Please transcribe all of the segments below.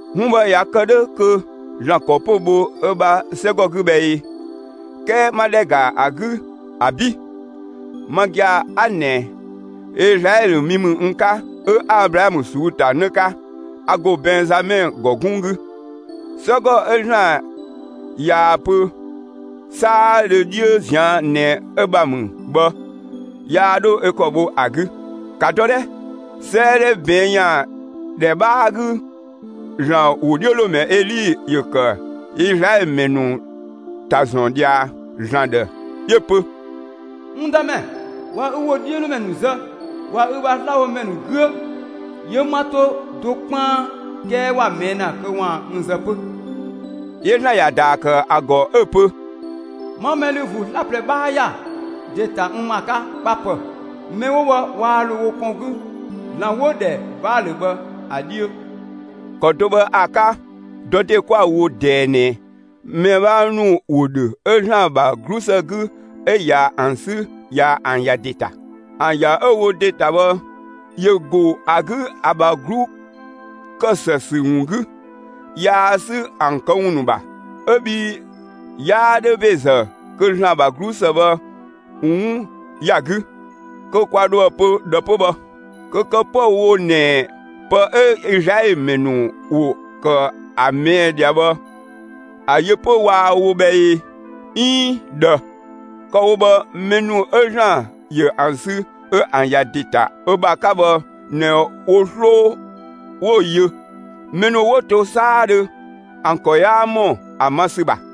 'Wun bhë ꞊ya kë 'dhö, kö ‑Zlan ‑kɔ 'pö‑ bho ö ‑bha 'sɛgɔ 'gü bhë ꞊ee? 'Kɛɛ 'ma ‑dhɛ ‑ga ‑a 'gü, ‑abi'! Ma gia‑ 'a ꞊nɛ, Izlaɛlö mi ‑mü n 'ka; 'ö 'a Ablaamö ꞊suu'‑ ‑ta ‑në 'ka. A ‑go Bɛnzamɛ ‑gɔ 'gunng 'gü. 'Sɛgɔ 'ö ‑Zlan ꞊yaa‑ pö 'saadhö 'dhiö ꞊zian' ꞊nɛ ö ‑bha ‑mü bhë, yaa 'dho ö ‑kɔ bho ‑a 'gü. ‑Ka dɔ 'dhɛ! 'Sëëdhɛ ꞊bɛɛn' ‑yan ‑dhɛ 'bhaa 'gü, ‑Zlan ‑wodhiölomɛ Eli ‑yö ‑kë Izlaɛlö ‑mɛ ‑nu ‑ta ‑zɔn ꞊dhia ‑Zlan ‑dhë. 'Yö‑ pö: N Dëmɛ, ꞊wa ü ‑wodhiölomɛ ‑nu zë, ꞊wa ü ‑bha slabhodhɛ ‑nu 'güö. 'Yö 'ma 'to do 'kpaan, 'kɛɛ ‑wa ꞊mɛɛ' ‑na kö ‑waan n zë 'pö. 'Yö ‑Zlan ‑ya ‑daa ‑kë ‑a ‑gɔ 'ö‑ pö: 'Ma mɛ ‑lü ‑vuu 'slaplɛ 'bhaa ‑ya ‑de ‑ta n ‑ma 'ka 'kpa 'pë‑; mɛ 'wo bhë waa ‑lo wo kpɔn 'gü ‑zlan 'wo‑ ‑dhɛ Baalö bhë ‑a 'dhiö. ‑Kɔ do bhë ‑a 'ka, dɔ ‑de 'kwa‑ wo ꞊dɛɛ ꞊nɛ, mɛ 'bhaa ‑nu ‑wo ‑dhö 'ö ‑Zlan ‑bha 'glusë 'gü 'ö ꞊ya ‑an 'sü ꞊ya ‑an ‑ya ‑de ‑ta. ‑An ‑ya 'ö‑ wo ‑de ‑ta bhë, ‑yö ‑go ‑a 'gü ‑a ‑bha 'glu ‑kë ‑së ‑sü ‑wun 'gü; yaa 'sü ‑an këwun ‑nu ‑bha. 'Ö bhii 'yaa 'dhö ‑bezë kö ‑Zlan ‑bha 'glusë bhë 'wun ‑ya 'gü. Kö kwa ‑dhoë pö ꞊dhë 'pö bhë? Kö kë 'püë‑ wo ꞊nɛ, pë 'ö Izlaɛlö ‑mɛ ‑nu ‑wo ‑kë ‑a ꞊mɛɛ' ꞊dhia bhë, ‑a yö 'pö waa‑ wo bhë ee, 'iin ꞊dhë? Kë‑ wo bhë, mɛ ‑nu 'ö ‑Zlan ‑yö ‑an sü 'ö ‑an ‑ya ‑de ‑ta ö ‑bha 'ka bhë ꞊nɛ wo 'sloo 'wo‑ yö. Mɛ ‑nu 'wo to 'saadhö, ‑an ‑kɔ 'yaa ‑mɔ ‑a ma ‑sü ‑bha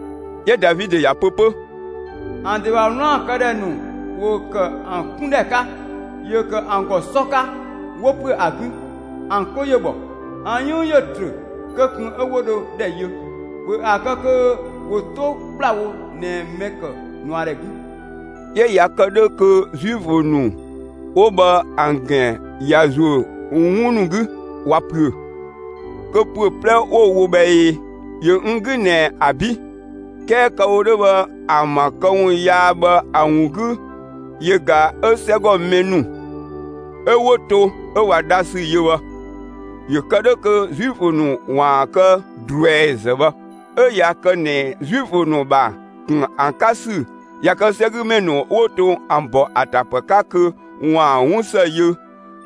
'Yö Davidö ‑ya pö 'pö: ‑An ‑de ‑bha 'wlaan‑ këdhɛ ‑nu ‑wo ‑kë ‑an 'kundhɛ 'ka, ‑yö ‑kë ‑an ‑gɔ 'sɔ 'ka ‑wo ‑püö ‑a 'gü; ‑an 'klo ‑yö bhɔ; ‑an 'yënng ‑yö trö kö ꞊kun 'ö 'wo ‑dhɛ yö. ‑Bhö ‑a kë kö ‑wo 'to ‑kplawo ꞊nɛ mɛ‑ ‑kë ꞊nuadhɛ 'gü. 'Yö ꞊ya kë 'dhö kö Zuifö ‑nu 'wo bhë ‑an ‑gɛn ꞊ya ‑zuö 'wun ‑nu 'gü, ꞊wa ‑püö, kö ‑püö 'plɛ 'wo‑ wo bhë ꞊ee? ‑Yö n 'gü ꞊nɛ ‑abi'! 'Kɛɛ kë‑ wo 'dhö bhë, ‑an ‑bha këwun yaa bhë ‑a ‑wun 'gü yö ꞊ga 'ö 'sɛgɔ mɛ ‑nu 'ö 'wo to 'ö ꞊wa dhasü yö bhë. ‑Yö kë 'dhö kö Zuifö ‑nu ‑waan kë ꞊druɛizë bhë. 'Ö ꞊ya kë ꞊nɛ Zuifö ‑nu ‑bha ‑kun ‑a 'ka ‑sü ꞊ya kë 'sɛgümɛ ‑nu 'wo to ‑an ‑bɔ ‑a ‑ta ‑pë 'ka kö ‑waan 'wun ‑së yö,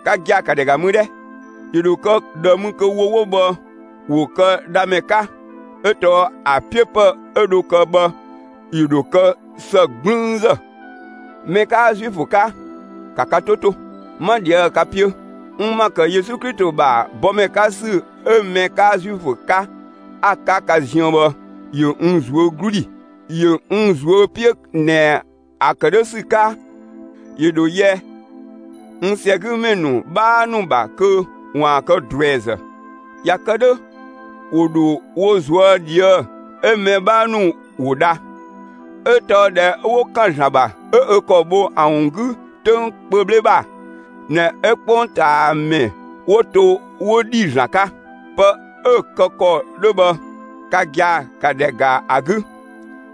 ka gia‑ ‑ka ‑dhɛ ‑ga mü 'dhɛ! ‑Yö ‑dho kë ꞊dhë mü kö wo 'wo bhë, ‑wo kë dhamɛ 'ka, 'ö tɔɔ ‑a 'piö ‑pë 'ö dho kë bhë ‑yö ‑dho kë ‑së 'gblüünzë. Mɛ 'kaa Zuifö 'ka, ‑ka ka 'to 'to! 'Ma ꞊dhië' ka 'piö. N ‑ma ‑kë Yesu Klito ‑bha bɔmɛ 'ka ‑sü 'ö mɛ 'kaa Zuifö 'ka 'a‑ 'ka ka ziën bhë, ‑yö n ꞊zuö' 'glu ‑dhi. ‑Yö n ꞊zuö' 'piö ꞊nɛ ‑a ‑kë 'dhö ‑sü 'ka, ‑yö ‑dho yɛ n ‑sɛgümɛ ‑nu 'bhaa ‑nu ‑bha kö ‑waan kë ꞊druɛizë. ꞊Ya kë 'dhö, ‑wo ‑dho wo ꞊zuö' ꞊dhië'‑, 'ö‑ mɛ 'bhaa ‑nu ‑wo dha. 'Ö tɔɔ ꞊dhɛ 'ö 'wo ‑kan ‑Zlan ‑bha 'ö ö ‑kɔ bho ‑an 'gü 'töng kpö 'bhle ‑bha, ꞊nɛ 'ö 'kpongtaamɛ 'wo to, 'wo ‑dhi ‑Zlan 'ka. Pë 'ö‑ kë ‑kɔ 'dhö bhë, ka gia‑ 'ka ‑dhɛ ‑ga ‑a 'gü,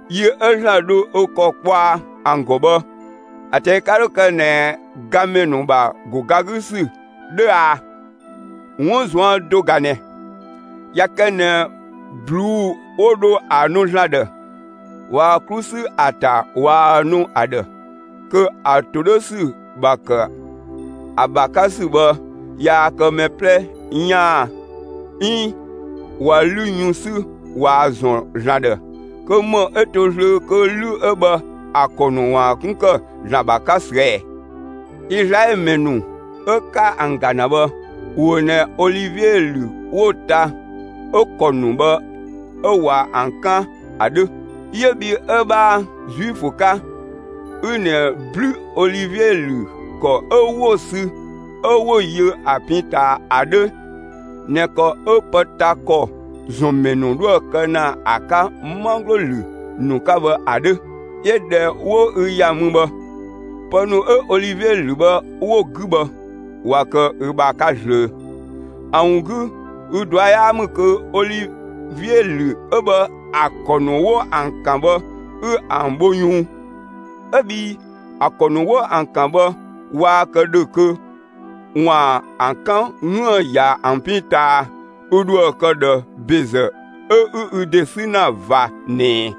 yi 'ö ‑Zlan dho ö ‑kɔ kpɔa ‑an ‑gɔ bhë, ‑a ꞊tɛi' ka 'dho kë ꞊nɛ gamɛ ‑nu ‑bha ‑go ga 'gü ‑sü 'dhö aa? 'Wun ꞊zuan' do ꞊ga ꞊nɛ: ꞊Ya kë ꞊nɛ ꞊bluu'‑ 'wo dho ‑a nu ‑Zlan ‑dhë, ꞊waa‑ 'klu 'sü ‑a ‑ta ꞊waa‑ nu ‑a ‑dhë, kö ‑a ‑to 'dhö ‑sü ‑bha ‑kë ‑a ‑bha 'ka ‑sü bhë yaa kë mɛ 'plɛ 'yaan aa! 'Iin ꞊wa 'lü yun 'sü ꞊waa‑ ‑zɔn ‑Zlan ‑dhë, kö ‑më 'ö to zlöö kö 'lü 'ö bhë ‑a ‑kɔ ‑nu ‑waan 'kun ‑kë ‑Zlan ‑bha 'ka ꞊süë' ɛɛ! Izlaɛlö ‑mɛ ‑nu 'ö 'ka ‑an ‑ga ‑na bhë, ‑wo ꞊nɛ olivie ‑lü 'wo‑ ta 'ö‑ ‑kɔ ‑nu bhë 'ö ꞊wa ‑an 'kan ‑a 'dhö; 'yö bhi 'ö 'bhaa Zuifö 'ka, 'ü ꞊nɛ 'blü olivie ‑lü ‑kɔ 'ö 'wo‑ sü 'ö 'wo‑ yö ‑a pin ꞊taa ‑a 'dhö (꞊nɛ ‑kɔ 'ö pë ta ‑kɔ ‑zɔn ‑mɛ ‑nu 'dhoë‑ kë ‑na ‑a 'ka 'manglo ‑lü ‑nu 'ka bhë ‑a 'dhö). 'Yö ꞊dhɛ 'wo ü ‑ya mü bhë, pë ‑nu 'ö olivie ‑lü bhë 'wo‑ 'gü bhë, ꞊wa kë ü ‑bha 'ka zlöö. ‑A ‑wun 'gü ü ꞊dua' 'yaa ‑mü kö olivie ‑lü 'ö bhë ‑a ‑kɔ ‑nu 'wo ‑an 'kan bhë ü ‑an bho yunng. 'Ö bhii (‑a ‑kɔ ‑nu 'wo ‑an ‑kan bhë) waa kë ‑dhö kö ‑waan ‑an 'kan 'üën‑ ‑ya ‑an pin ꞊taa, ü ‑dhoë kë ꞊dhë ‑bezë 'ö 'ü ü ‑de 'sü ‑na ꞊va ꞊nɛɛ.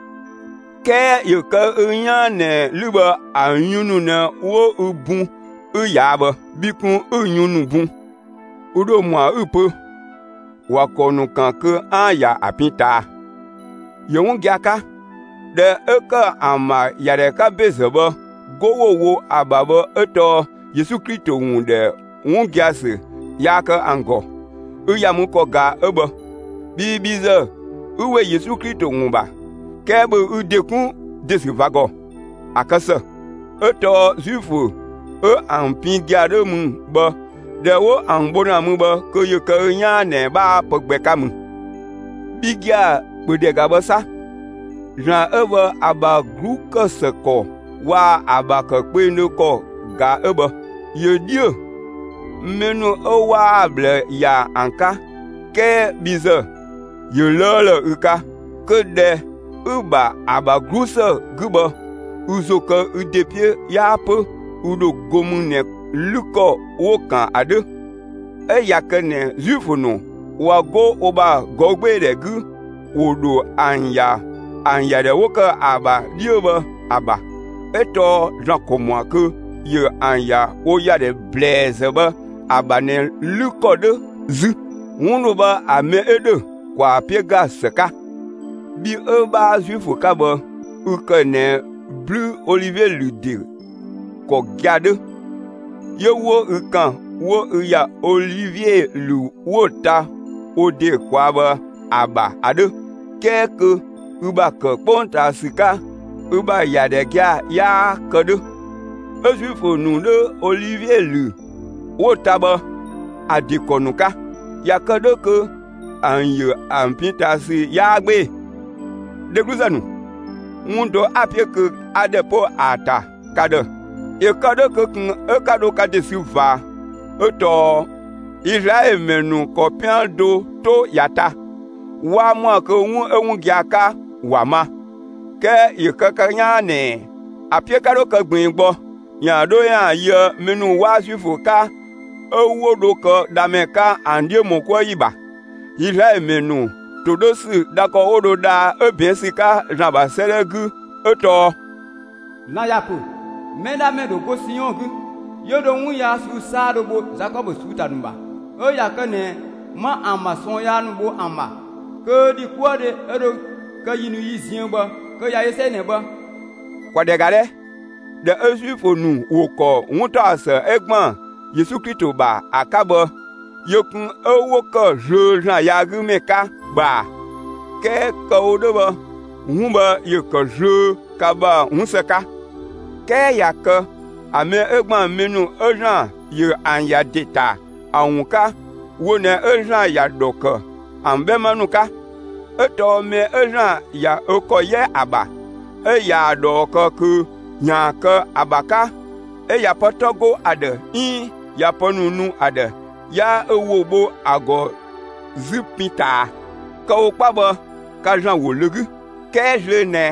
'Kɛɛ ‑yö kë ü 'yaan ꞊nɛ 'lü bhë ‑a yun ‑nu ꞊nɛ 'wo ü bun 'ü ꞊yaa' bhë; bhi kun 'ü‑ yun ‑nu bun. Ü ‑dho ‑mɔa 'ü‑ pö: «‑Wa ‑kɔ ‑nu ‑kan kö 'aan‑ ‑ya ‑an pin ꞊taa.» ‑Yö 'wun gia‑ 'ka. ‑Dhɛ 'ö ‑kë ‑an ‑bha ‑yadhɛ 'ka ‑bezë bhë, 'go 'wo‑ wo ‑a ‑bha bhë 'ö tɔɔ Yesu Klito ‑wun ‑dhɛ 'wun gia‑ ‑sü yaa kë ‑an ‑gɔ. Ü ‑ya mü ‑kɔ ꞊ga 'ö bhë, bhii bhi ‑zë ü ‑we Yesu Klito ‑wun ‑bha. 'Kɛɛ ‑bhö ü ‑de 'kun ‑de ‑sü ꞊va ‑gɔ. ‑A kë ‑së. 'Ö tɔɔ Zuifö 'ö ‑an pin gia‑ 'dhö ‑mü bhë, ꞊dhɛ 'wo ‑an bho ‑na mü bhë kö ‑yö kë ü 'yaan ꞊nɛ 'bhaa pë gbɛ 'ka mü. Bhi gia‑, ‑bhö ‑dhɛ ‑ga bhë 'sa. ‑Zlan 'ö bhë ‑a ‑bha 'glu ‑kë ‑së ‑kɔ waa‑ ‑a ‑bha ‑kë kpengdhö ‑kɔ ꞊ga 'ö bhë. ‑Yö 'dhiö‑, mɛ ‑nu 'ö 'waa‑ ꞊bhlë ‑ya ‑an 'ka 'kɛɛ bhi ‑zë ‑yö 'lëëlë ü 'ka. Kö ‑dhɛ 'ü‑ ‑bha ‑a ‑bha 'glusë 'gü bhë, ü ‑zo kë ü ‑de 'piö 'yaa 'pö ü ‑dho go mü ꞊nɛ 'lü ‑kɔ 'wo‑ ‑kan ‑a 'dhö. 'Ö ꞊ya kë ꞊nɛ Zuifö ‑nu ꞊wa 'go wo ‑bha ꞊gɔü' 'gbee‑ 'gü, ‑wo ‑dho ‑an ‑ya ‑an ‑yadhɛ 'wo ‑kë ‑a ‑bha 'dhiö bhë ‑a ‑bha. 'Ö tɔɔ ‑Zlan ‑kɔ ‑mɔa kö ‑yö ‑an ‑ya wo ‑yadhɛ ‑blɛɛzë bhë ‑a ‑bha ꞊nɛ 'lü ‑kɔ 'dhö 'zü. 'Wun ‑nu bhë ‑a mɛ 'ö ‑dhö, ‑kwaa 'piö ‑ga ‑së 'ka. Bhi 'ö 'bhaa Zuifö 'ka bhë, ü ‑kë ꞊nɛ 'blü olivie ‑lü ‑de ‑kɔ gia‑ 'dhö. 'Yö 'wo ü ‑kan 'wo ü ‑ya olivie ‑lü 'wo‑ ta wo ‑de ꞊kwaa' bhë ‑a ‑bha ‑a 'dhö, 'kɛɛ kö ü ‑bha ‑kë 'kpongtaa ‑sü 'ka, ü ‑bha ‑ya ‑dhɛ gia‑ 'yaa kë 'dhö. 'Ö Zuifö ‑nu 'dhö olivie ‑lü 'wo‑ ta bhë ‑a ‑de ‑kɔ ‑nu 'ka. ꞊Ya kë 'dhö kö ‑an ‑yö ‑an pin ꞊taa ‑sü 'yaa 'gbee‑. Dhegluzë ‑nu, 'wun do 'a‑ 'piö kö 'a ‑dhɛ 'po ‑a ‑ta ka ‑dhë, ‑yö kë 'dhö kö ꞊kun 'ö 'ka dho ka ‑de sü ꞊va 'ö tɔɔ: Izlaɛlö ‑mɛ ‑nu ‑kɔ 'pian do 'to ‑ya ta; 'waa ‑mɔa kö 'wun 'ö 'wun gia‑ 'ka ‑wa ma. 'Kɛɛ ‑yö kë ka 'yaan ꞊nɛ ‑a 'piö 'ka 'dho kë ꞊gbiin gbɔ, ‑yaan 'dho ‑yaan yöë mɛ ‑nu 'waa Zuifö 'ka 'ö 'wo dho kë dhamɛ 'ka, ‑an 'dhiö ‑mɔ 'kuë ‑yi ‑bha. Izlaɛlö ‑mɛ ‑nu ‑todhösü dha ‑kɔ 'wo dho dhaa 'ö ꞊bɛɛn' ‑sü 'ka ‑Zlan ‑bha 'sëëdhɛ 'gü 'ö tɔɔ: ‑Zlan ‑ya ‑pö: Mɛdhamɛ ‑dho go Siɔn 'gü, 'yö dho 'wun yaa ꞊suu'‑ 'saadhö bho Zakɔbö ꞊suu'‑ ‑ta ‑nu ‑bha. 'Ö ꞊ya kë ꞊nɛ 'ma ‑an ‑bha ꞊sɔɔn yaa bho ‑an ‑bha kö ‑dhi 'kuë‑ 'ö dho kë yi ‑nu yi ziën bhë, kö ꞊ya yö 'sɛi ꞊nɛ bhë. ‑Kwa ‑dhɛ ‑ga 'dhɛ! ꞊Dhɛ 'ö Zuifö ‑nu ‑wo ‑kɔ 'wuntaɔsë ('ö ‑gban Yesu Klito ‑bha ‑a) 'ka bhë, yö kun 'ö 'wo ‑kë zlöö ‑Zlan yaagümɛ 'ka bhë ꞊a! 'Kɛɛ kë‑ wo 'dhö bhë 'wun bhë ‑yö ‑kë zlöö ka ‑bha 'wun ‑së 'ka. 'Kɛɛ ꞊ya kë ‑a mɛ 'ö ‑gban mɛ ‑nu 'ö ‑Zlan ‑yö ‑an ‑ya ‑de ‑ta ‑a ‑wun 'ka, wo ꞊nɛ 'ö ‑Zlan ‑ya ‑dhɔ ‑kë ‑an 'bhɛma ‑nu 'ka. 'Ö tɔɔ mɛ 'ö ‑Zlan ꞊ya ö ‑kɔ 'yɛ ‑a ‑bha, 'ö ꞊yaa‑ ꞊dhɔɔ kë kö ‑yaan kë ‑a ‑bha 'ka, 'ö ꞊ya pë 'tɔ 'go ‑a ‑dhë, 'iin ꞊ya pë ‑nu nu ‑a ‑dhë, 'yaa ö ‑wo bho ‑a ‑gɔ 'zü pin ꞊taa. Kë‑ wo 'kpa bhë, ka ‑Zlan ‑wo ‑lö 'gü; 'kɛɛ zlöö ꞊nɛ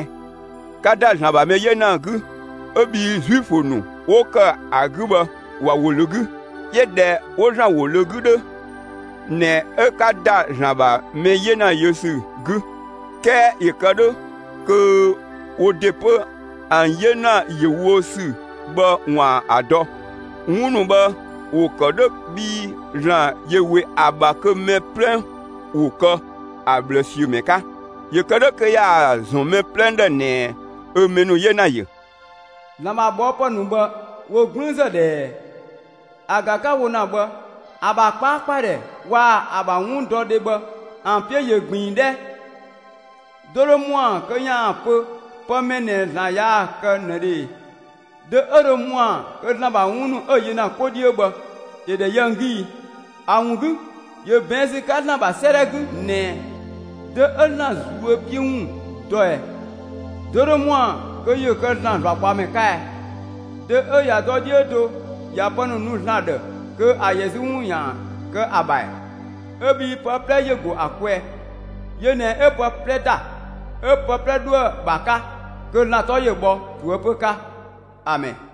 'ka ‑da ‑Zlan ‑bha mɛ 'yena 'gü 'ö bhii Zuifö ‑nu ('wo kë ‑a 'gü bhë) ‑wa ‑wo ‑lö 'gü. 'Yö ꞊dhɛ 'wo ‑Zlan ‑wo ‑lö 'gü 'dhö ꞊nɛ 'ö 'ka ‑da ‑Zlan ‑bha mɛ 'yena yö ‑sü 'gü; 'kɛɛ ‑yö kë 'dhö kö wo ‑de 'pö ‑an 'yena ‑yö wo ‑sü bhë ‑waan ‑a dɔ. 'Wun ‑nu bhë ‑wo ‑kë 'dhö bhii ‑Zlan ‑yö ‑we ‑a ‑bha kö mɛ 'plɛ ‑wo kë ‑a ꞊bhlë ‑siö ‑mɛ 'ka ‑yö kë 'dhö kö ‑yaan ‑a ‑zɔn mɛ 'plɛ ‑dhë ꞊nɛ 'ö mɛ ‑nu 'yena ‑yö. ‑Zlan ‑bha ꞊bhɔɔpë ‑nu bhë, ‑wo 'gblüünzë ꞊dhɛɛ! ‑A ꞊ga 'ka‑ wo ‑na bhë, ‑a ‑bha 'kpaakpadhɛ waa‑ ‑bha 'wundɔdhe bhë ‑an 'piö ꞊yö ꞊gbiin 'dhɛ! Dö dho ‑mɔa kö ‑yaan pö pë mɛ ꞊nɛ ‑Zlan ‑ya ‑kë ꞊nëdhö ꞊e? Dö 'ö dho ‑mɔa kö ‑Zlan ‑bha 'wun ‑nu 'ö‑ yö ‑na 'ko 'dhiö bhë ‑yö ‑dhɛ yö ‑an 'gü ii? ‑A ‑wun 'gü, ‑yö ꞊bɛɛn' ‑sü 'ka ‑Zlan ‑bha 'sëëdhɛ 'gü ꞊nɛ: Dö 'ö ‑Zlan ꞊zuö' 'piö ‑wun dɔ ꞊ɛɛ? Dö dho ‑mɔa kö ‑yö kë ‑Zlan ‑zlakpaɔmɛ 'ka ɛɛ? Dö 'ö ꞊ya dɔ 'dhiö do ꞊ya pë ‑nu nu ‑Zlan ‑dhë kö ‑a ‑yɛ 'zü ‑wun ‑yaan kë ‑a ‑bha ‑ɛɛ? 'Ö bhii pë 'plɛ ‑yö ‑go ‑a kwɛɛ; yö ꞊nɛ 'ö pë 'plɛ ‑da, 'ö pë 'plɛ 'dhoë‑ ‑bha 'ka; kö ‑Zlan 'tɔ ‑yö bhɔ ꞊toëpö 'ka! Amɛn.